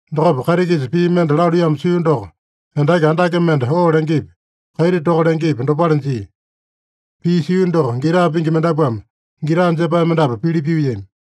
Dokopa kaiti-kisa pii mende laluiyamo sio doko, endaki andake mende oo lengepi, kaiti toka lengepi, dopale jia. Pii sio doko gita pingi mendapuame gita jepae mendapu pili pyuiyami.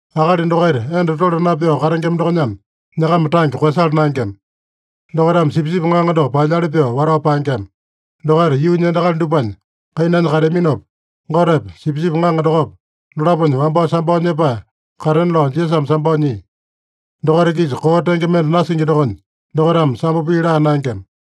Akali dokaita enda tole napyao katengema dokonyana, nyakama tange koeyasala naengema. Dokaitame Sipisipi Ŋaŋa doko paelyali pyoo watao paengema. Dokaita yuunya endakali dupanya kainanya kateaminopa, Gotepa, Sipisipi Ŋaŋa dokopa, dolaponya wambao sambao nyepae katena lao Jisasame sambao nyia. Dokaita-kisa koo tenge mende nasingi dokonya, dokaitame sambo pii laa naengema.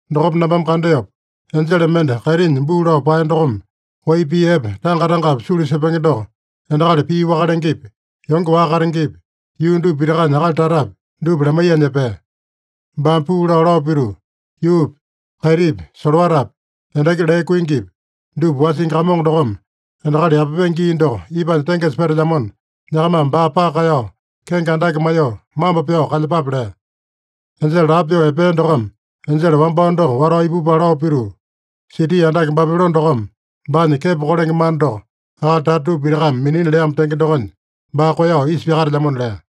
Dokopa nambame kandeopa, enjele mende kaitinya buu lao paeya dokome wai pii epe tanga-tangapi sulu sepenge doko endakali pii waka lengepi, yonge waka katengepi, yuu dupa pitakanya akali tatapi, dupa lamaiyanya epea. Baame puu lao, lao pituu, “Yuupi, kaitipi, solowatapi, endaki lee kuingipi, dupa wasingi Kamongo dokome endakali yapapenge gii doko ipanya tengesa petelyamona, nyakamame baa paka kaeyao, kenge andake maiyoo, mambo pyao kalyepape” lea. Enjele lapo pyoo epea dokome enjele wambao doko watao ipupala lao pituu, “Siti andake Babilone dokome baanya kepo kolenge mana doko akali tata dupa pitakame minina leamo tenge dokonya, baa koeyao isa pyakatelyamona” lea.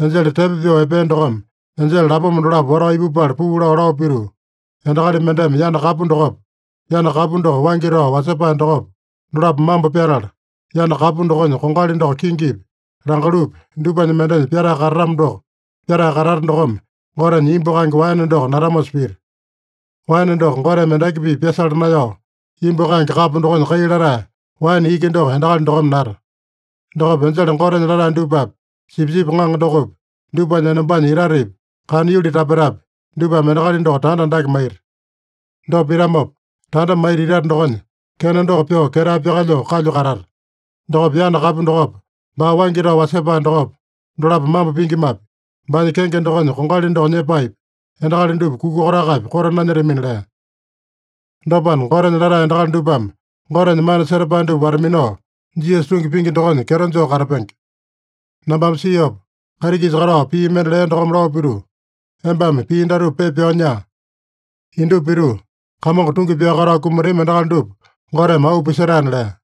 Enjele tepo pyoo epea dokome enjele lapoma dolapo watao ipupala puu lao, lao pituu, “Endakali mendeme yana kapu dokopa, yana kapu doko waingi tao wasepae dokopa, dolapo mambo pyatala, yana kapu dokonya kongali doko kingipi, langalupi dupanya mendenya pyatae katatamo doko, pyatae katata dokome Gotenya imbu kaenge waene doko natamosa pita. Waene doko Goteme endaki-pipa pyasala naeyao, imbu kaenge kapo dokonya kai latae waene iki doko endakali dokome nata. Dokopa enjele Gotenya latae dupapi, Sipisipi Ŋaŋa dokopi, dupanya enombanya itatepi, kana yuli tapetapi, dupame endakali doko tanda andake maita. Dopa pitamopa, tanda maita itate dokonya kena doko pyoo ketae pyakalyoo kalyu katata. Dokopa yana kapu dokopa, baa waingi tao wasepae dokopa, dolapo mambo pingimapi, baanya kenge dokonya kongali doko nyepaepi, endakali dupa kuka kotakapi koto nanyetamina” lea. Dopana, Gotenya latae endakali dupame Gotenya mana setapae dupa wata-minao, Jisasa tungi pingi dokonya kyeto joo katapenge. Nambame siopa, kaiti-kisa katao pii mende lea dokome lao pituu, “Embame pii datupa pepa pyao nyaa: ‘Indupa pituu, Kamongo tungi pyao katao kumatami endakali dupa Goteme auu pisetaena’” lea.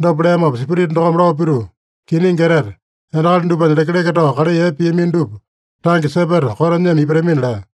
Dopa leamopa Spirita dokome lao pituu, “Kiningi etete, endakali dupanya lekeleke tao kalai epe piamino dupa tange sepeta koto nyema ipatamina” lea.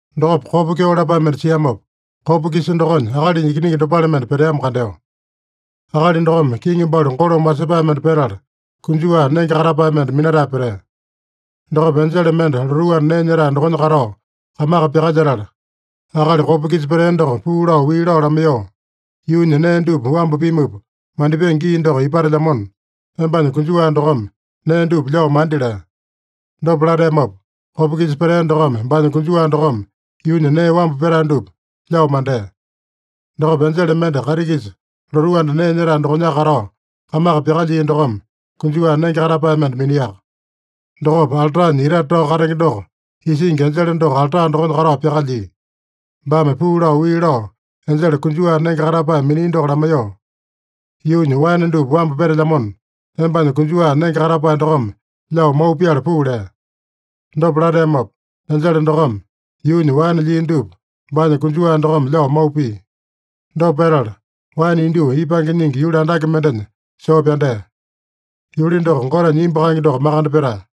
Dokopa kopa kyeo lapae mende siamopa, kopa-kisa dokonya akalinya ikiningi dopale mende peteamo kandeo. Akali dokome kiŋi balu golome wasepae mende petala, konjuwa nenge katapae mende minatae petea. Dokopa enjele mende lotuu anda nee nyetae dokonya katao kamaka pyakalyetala, akali kopa-kisa petea doko puu lao wii lao lamaiyoo, “Yuunya nee dupa wambu pimupa mandipenge gii doko ipatelyamona, embanya konjuwa dokome nee dupa lyao mandi” lea. Dopa lateamopa, kopa-kisa petea dokome baanya konjuwa dokome yuunya nee wambu petae dupa lyao mandea. Dokopa enjele mende kaiti-kisa lotuu anda nee nyetae dokonyaka katao kamaka pyakalyia dokome konjuwa nenge katapae mende miniaka. Dokopa altanya itate tao katenge doko isingi enjele doko alta dokonya katao pyakalyia. Baame puu lao wii lao enjele konjuwa nenge katapae minia doko lamaiyoo, “Yuunya waene dupa wambu petelyamona, embanya konjuwa nenge katapae dokome lyao mau pyala puu” lea. Dopa lateamopa, enjele dokome yuunya waene lyia dupa baanya konjuwa dokome lyao mau pia. Dopa petala, waene indyoo ipange nyingi yuli andake mendenya soo pyandea. Yuli doko Gotenya imbu kaenge doko makande petae.